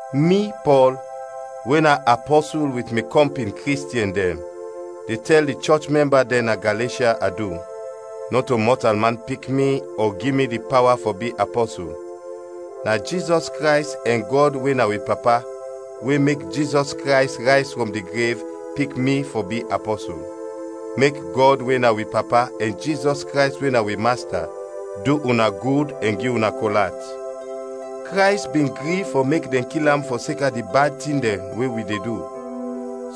Mi, Pɔl, we na apɔsul wit mi kɔmpin Kristiɛn dɛn, de tɛl di chɔch mɛmba dɛn na Galeshya adu. Nɔto mɔtalman pik mi ɔ gi mi di pawa fɔ bi apɔsul; na Jizɔs Krays ɛn Gɔd we na wi Papa we mek Jizɔs Krays rayz frɔm di grev, pik mi fɔ bi apɔsul. Mek Gɔd we na wi Papa ɛn Jizɔs Krays we na wi Masta du una gud ɛn gi una kol at. Krays bin gri fɔ mek dɛn kil am fɔseka di bad tin dɛn we wi de du,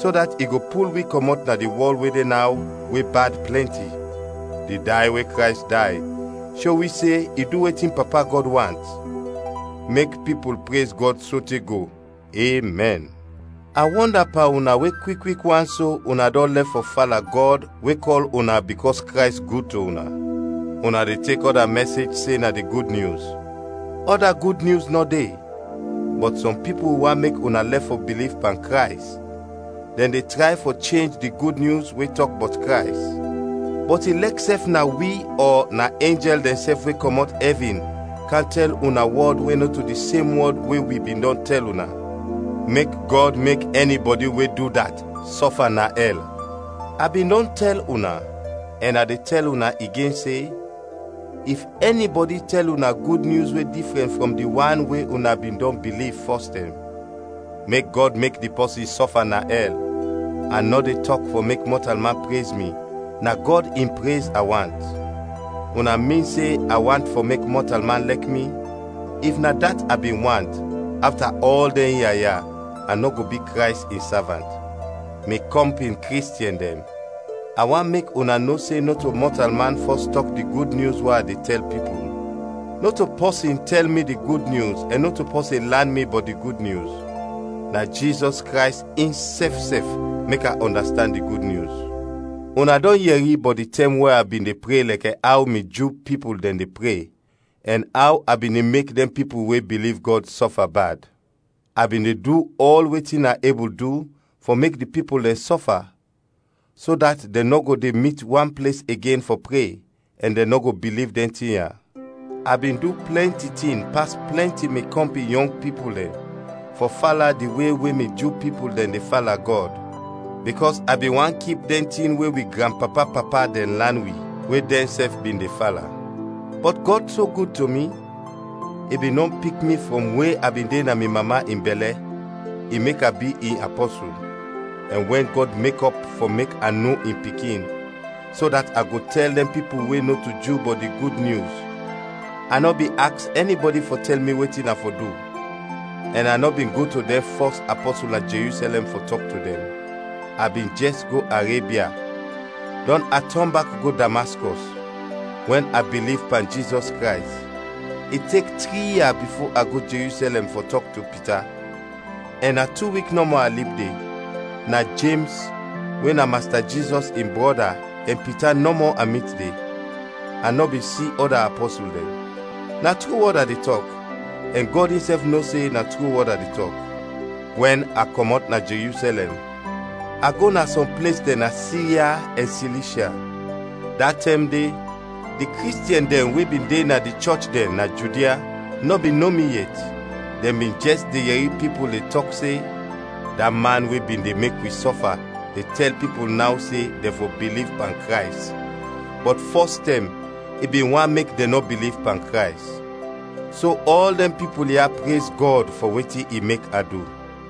so dat i go pul wi kɔmɔt na di wɔl we de naw we bad plɛnti. Di day we Krays day sho wi se i du wetin Papa Gɔd want. Mek pipul prez Gɔd sote go! Emɛn. A wɔnda pan una we kwik kwik wan so una dɔn lɛf fɔ fala Gɔd we kɔl una bikɔs Krays gud to una. Una de tek ɔda mɛsej se na di Gud Nyus. Ɔda gud nyus nɔ de, bɔt sɔm pipul want mek una lɛf fɔ biliv pan Krays, dɛn de tray fɔ chenj di Gud Nyus we tɔk bɔt Krays. Bɔt ilɛksɛf na wi ɔ na enjɛl dɛnsɛf we kɔmɔt ɛvin kam tɛl una wɔd we nɔto di sem wɔd we wi bin dɔn tɛl una, mek Gɔd mek ɛnibɔdi we du dat sɔfa na ɛl. A bin dɔn tɛl una, ɛn a de tɛl una igen se, if ɛnibɔdi tɛl una gud nyus we difrɛn frɔm di wan una bin dɔn biliv fɔs tɛm, mek Gɔd mek di pɔsin sɔfa na ɛl. A nɔ de tɔk fɔ mek mɔtalman prez mi, na Gɔd in prez a want. Una min se a want fɔ mek mɔtalman lɛk mi, if na dat a bin want, afta ɔl dɛn ia ya, a nɔ go bi Krays in savant. Mi kɔmpin Kristiɛn dɛn, a want mek una no se nɔto mɔtalman fɔs tɔk di Gud Nyus we a de tɛl pipul. Nɔto pɔsin tɛl mi di Gud Nyus ɛn nɔto pɔsin lan mi bɔt di Gud Nyus. Na Jizɔs Krays insɛf sɛf mek a ɔndastand di Gud Nyus. Una dɔn yɛri bɔt di tɛm we a bin de pre lɛkɛ aw mi Ju pipul dɛn de pre, ɛn aw a bin de mek dɛn pipul we biliv Gɔd sɔfa bad. A bin de du ɔl wetin a ebul du fɔ mek di pipul dɛn sɔfa, so dat dɛn nɔ go de mit wan ples igen fɔ pre, ɛn dɛn nɔ go biliv dɛn tin ya. A bin du plɛnti tin pas plɛnti mi kɔmpin yɔng pipul dɛn fɔ fala di we we mi Ju pipul dɛn de fala Gɔd, bikɔs a bin want kip dɛn tin we wi granpapa-papa dɛn lan wi, we dɛnsɛf bin de fala. Bɔt Gɔd so gud to mi, i bin dɔn pik mi frɔm we a bin de na mi mama in bɛlɛ, i mek a bi in apɔsul. Ɛn wɛn Gɔd mekɔp fɔ mek a no in Pikin, so dat a go tɛl dɛn pipul we nɔto Ju bɔt di Gud Nyus, a nɔ bin aks ɛnibɔdi fɔ tɛl mi wetin a fɔ du, ɛn a nɔ bin go to dɛn fɔs apɔsul na Jerusɛlɛm fɔ tɔk to dɛn. A bin jɛs go Arebia, dɔn a tɔn bak go Damaskɔs. Wɛn a biliv pan Jizɔs Krays, i tek tri ia bifo a go Jerusɛlɛm fɔ tɔk to Pita, ɛn na tu wik nɔmɔ a lib de. Na Jems we na Masta Jizɔs in brɔda ɛn Pita nɔmɔ a mit de, a nɔ bin si ɔda apɔsul dɛn. Na tru wɔd a de tɔk, ɛn Gɔd insɛf no se na tru wɔd a de tɔk. Wɛn a kɔmɔt na Jerusɛlɛm, a go na sɔm ples dɛn na Sirya ɛn Silishya. Da tɛm de di Kristiɛn dɛn we bin de na di chɔch dɛn na Judia nɔ bin no mi yet. Dɛn bin jɛs de yɛri pipul de tɔk se, “Da man we bin de mek wi sɔfa de tɛl pipul naw se dɛn fɔ biliv pan Krays, bɔt fɔs tɛm i bin want mek dɛn nɔ biliv pan Krays.” So ɔl dɛn pipul ya prez Gɔd fɔ wetin i mek a du.